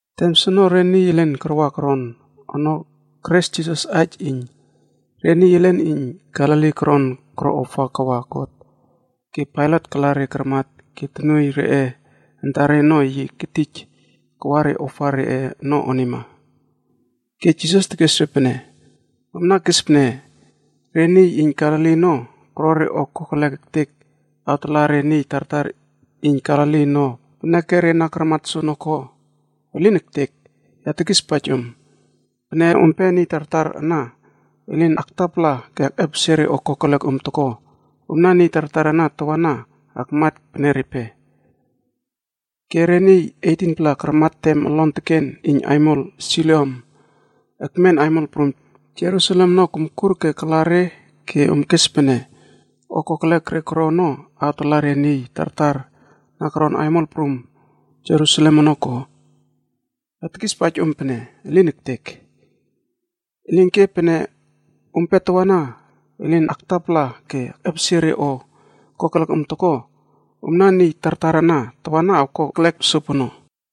Tem soono re niy elen karama koron ono keres Jisas aij iyn re niy elen iyn Galili koron koro ofa kawa God ke Pailat kala re karmat ke tonuoiy reꞌe antare ono yi ketij kawa re ofa reꞌe ono onima. Ke Jisas tekes re pene, “Omna kes pene re niy iyn Galili ono, koro re o koro kerlek ektek awtala re niy tartar iyn Galili ono peneke re na karmat soono ko? Elin ektek! Ya tekispaij om. Pene ompe niy tartar ana elin aktapala ke akꞌepesie re o kokelek om toko, omna niy tartar ana tawana akmat pene repe. Ke re niy 18-pla karmat tem olon teken iyn aimol Siloam ekmen aimol prum Jerusalem ono komkur ke kala re ke om kes pene o kokelek re koro ono awtala re niy tartar na koron aimol prum Jerusalem ono ko? Ya tekispaij om pene, elin ektek. Elinke pene ompe tawana elin aktapala ke akꞌepesie re o kokelek om toko, omna niy tartar ana tawana awko eklek sopono.”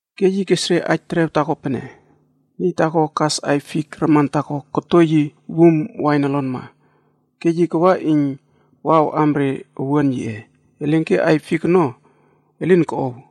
Ke yi kes re aij terew taako pene, “Niy taako kas aiy fik raman taako koto yi wum wain olonma, ke yi kawa iyn awꞌam re owuan yiꞌe, elinke aiy fik ono elin koꞌow.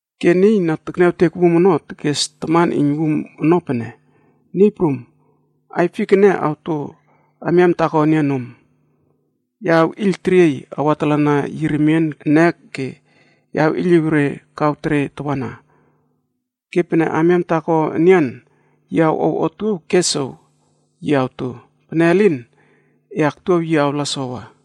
“Ke niy na tekniawtek wum ono tekes taman iyn wum ono pene, ‘Niy prum, aiy fik ene awto amiam taako enian nom. Ya awꞌiyl teriey awatalana yi remien ene ke ya awꞌiyliw re kaw tere tawana. Ke pene amiam taako enian yi awꞌow otuow ke sow, yi awto. Pene elin, e aktuaw yi awla sowa.’”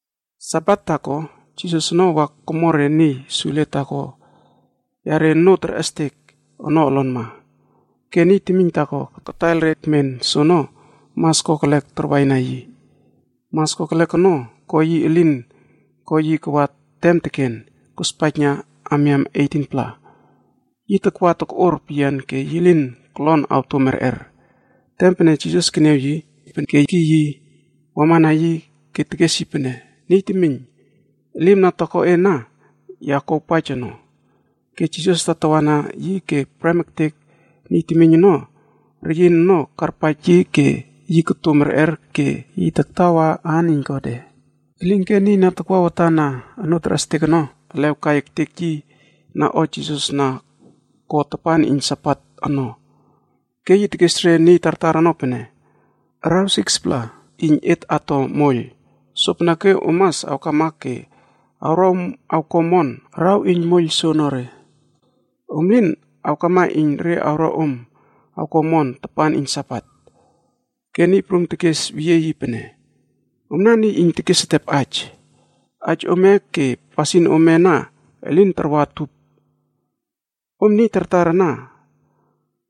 Sabat taako, Jisas ono wa komo re niy sule taako yare onoo terꞌestek ono olonma. Ke niy temiyn taako kataiyl re kemen soono, mas kokelek takwaina yi. Mas kokelek ono ko yi elin ko yi kawa tem teken, kospaijna amiam 18-pla. Yi takwa tokꞌor peyian ke yi lin kolon awto merꞌer. Tem pene Jisas keniaw yi, yi kekiy yi wamana yi ke tekes yi pene, “Niy temiyn, Elim na toko e ana ya kuawpaij ono.” Ke Jisas tatawa na yi ke prem ektek niy temiyn ono reyin ono karpaij yi ke yi koto merꞌer ke yi taktawa aan iyn Godꞌe. Elinke niy na takwa watan na onoo terꞌestek ono elew kai ektek yi na o Jisas na ko tapan iyn Sabat ono. Ke yi tekes re niy tartar ono pene, “Araw 6-pla iyn et ato moiyl, sopeneke om mas awkama ke awro om awko omon araw iyn moiyl soonore. Om lin awkama iyn re awro om awko omon tapan iyn Sabat.” Ke Niy Prum tekes weyie yi pene, “Omna niy iyn tekes etep aij! Aij ome ke pasin ome ana elin tarwa utup. Om niy tartar ana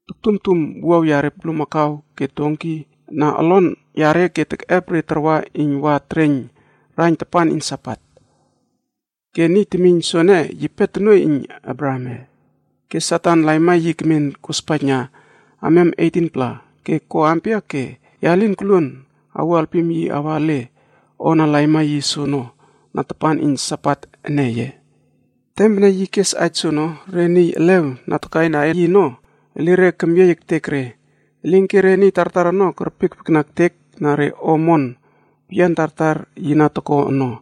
toktumtum wuaw yare bulmakau ke donki na olon yare ke tekꞌep re tarwa iyn wa tereiyn raiyn tapan iyn Sabat. Ke niy temiyn soene yipe tonuoiy iyn Abrahamꞌe ke Satan laima yi kemen kospaijna amiam 18-pla ke ko ampia ke ya lin koluon awuo alpim yi awa ele o na laima yi soono na tapan iyn Sabat ene ye?” Tem pene yi kes aij soono, re niy elew na takaina yi ono, elire kemyiey ektek re. Elinke re niy tartar ono kerpiekpiekna ektek na re o omon peyian tartar yi na toko ono.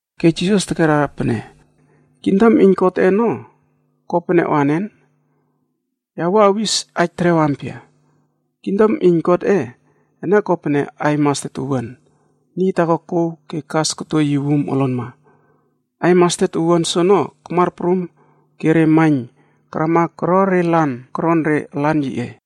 Ke Jisas tekera pene, “Kingdom iyn Godꞌe ono ko pene o anen? Ya wua awis aij terew ampia? kingdom iyn Godꞌe ene kopene aiy mastet owuan, niy taako kouw ke kas koto yi wum olonma. Aiy mastet owuan soono kamar prum ke re maiyn karama ke koro re lan koron re alan yiꞌe.”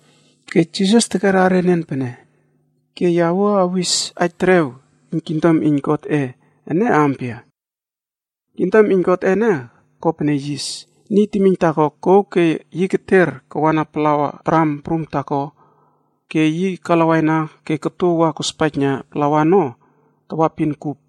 Ke Jisas tekera enian pene, “Ke ya wua awis aij terew iyn kingdom iyn Godꞌe ene ampia? kingdom iyn Godꞌe ene kopene yis, niy temiyn taako kouw ke yi keter kawana plawa dram prum taako ke yi kalawaina ke koto wa kospaijna plawa ono tawapin kup.”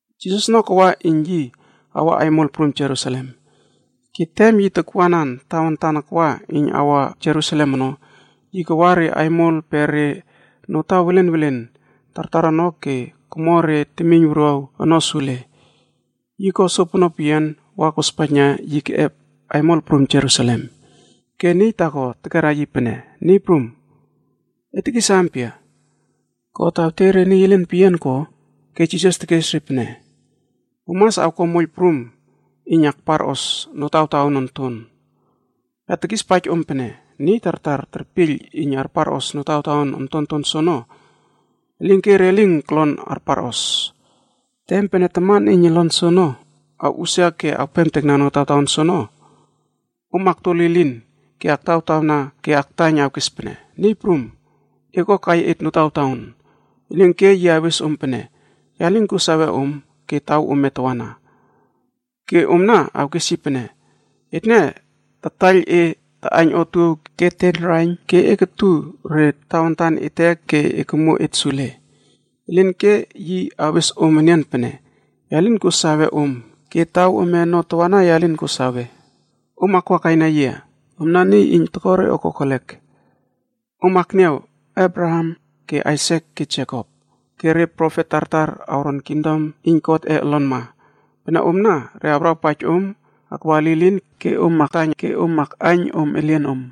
Jisas ono kawa iyn yi awa aimol prum Jerusalem. Ke tem yi takwanan tawantan akwa iyn awa Jerusalem ono, yi kawa re aimol pe re notaw welen welen tartar ono ke komo re temiyn wuruaw ono sule. Yi ko sopono peyian wa kospaijna yi keꞌep aimol prum Jerusalem. Ke niy taako tekera yi pene, “Niy Prum, e tekis ampia, God awtiey re niy koro omon omon ono peyian ko?” Ke Jisas tekes re pene, “Om mas awko moiyl prum iyn akparꞌos notawtaon onton. Ya tekispaij om pene, niy tartar terpiyl iyn arparꞌos notawtaon ontonton soono, elinke re lin kolon arparos. Tem pene taman iyn olon soono awꞌusia ke awpemtekna notawtaon soono, om akto lilin ke aktawtawna ke aktaiyn awkes pene, ‘Niy Prum, ekꞌuakai et notawtaon.’ Elinke yi awes om pene, ‘Ya lin kuo sawe om ke taw ome tawana.’ “Ke omna awkes yi pene, ‘Etne tataiyl e taꞌaiyn otuow ke teiyn raiyn ke e kutu re tawantan ete ke e komuo et sule.’ “Elinke yi awes om enian pene, ‘Ya lin kuo sawe om ke taw ome ono tawana ya lin kuo sawe. Om akwa kaina yia, omna niy iyn toko re o kokelek.’ “Om akniaw Abraham ke Aisak ke Jekopa ke re profet tartar awron kingdom iyn Godꞌe olonma. Pene omna re awrawpaij om akwa lilin ke om aktaiyn ke om akꞌaiyn om elienom.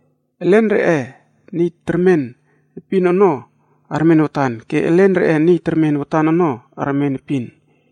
Elen reꞌe niy termen epin ono armen watan ke elen reꞌe niy termen watan ono armen epin.”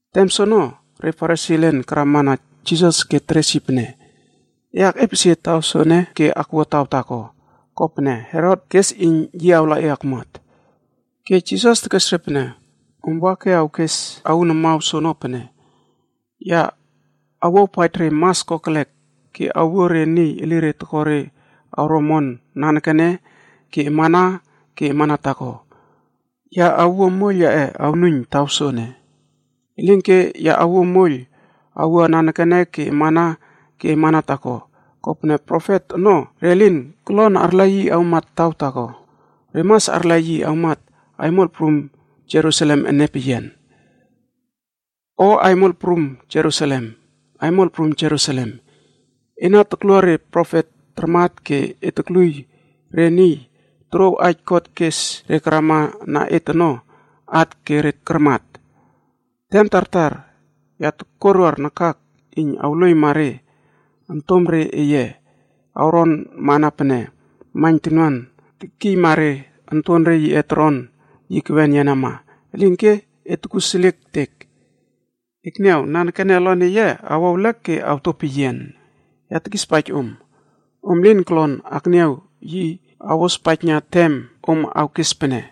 Tem soono, re Farisi elen karama na Jisas ke teres yi pene, “E akꞌepesie taw soene ke akwua taw taako, kopene Herot kes iyn yi awla e akmuat.” Ke Jisas tekes re pene, “Om wa ke awkes aun amaw soono pene, Ya awuawpaij re mas kokelek ke awuo re niy elire tokore awro omon nanekene ke amana ke amana taako, ya awuo moiyl yaꞌe awnuiyn taw soene.” Elinke ya awuo moiyl awua nanekene ke amana ke amana taako, kopene profet ono re lin kolon arla yi awmat taw taako, re mas arla yi awmat aimol prum Jerusalem ene peyian. “O Aimol prum Jerusalem! Aimol prum Jerusalem! Ena toklua re profet tarmat ke e tokluiy re niy torouw aij God kes re karama na et ono, at ke re karmat. Tem tartar ya tokuaruar nakak iyn awluoiyma re ontomre eye awronmana pene maiyn tonuan tekiyma re ontonre yiꞌe toron yi kewen yenama. Elinke e tokuseliek ektek! Ekniaw! Nanekene olon eye awo ewlek ke awto peyian. Ya tekispaij om, om lin kolon akniaw yia awospaijna tem om awkes pene,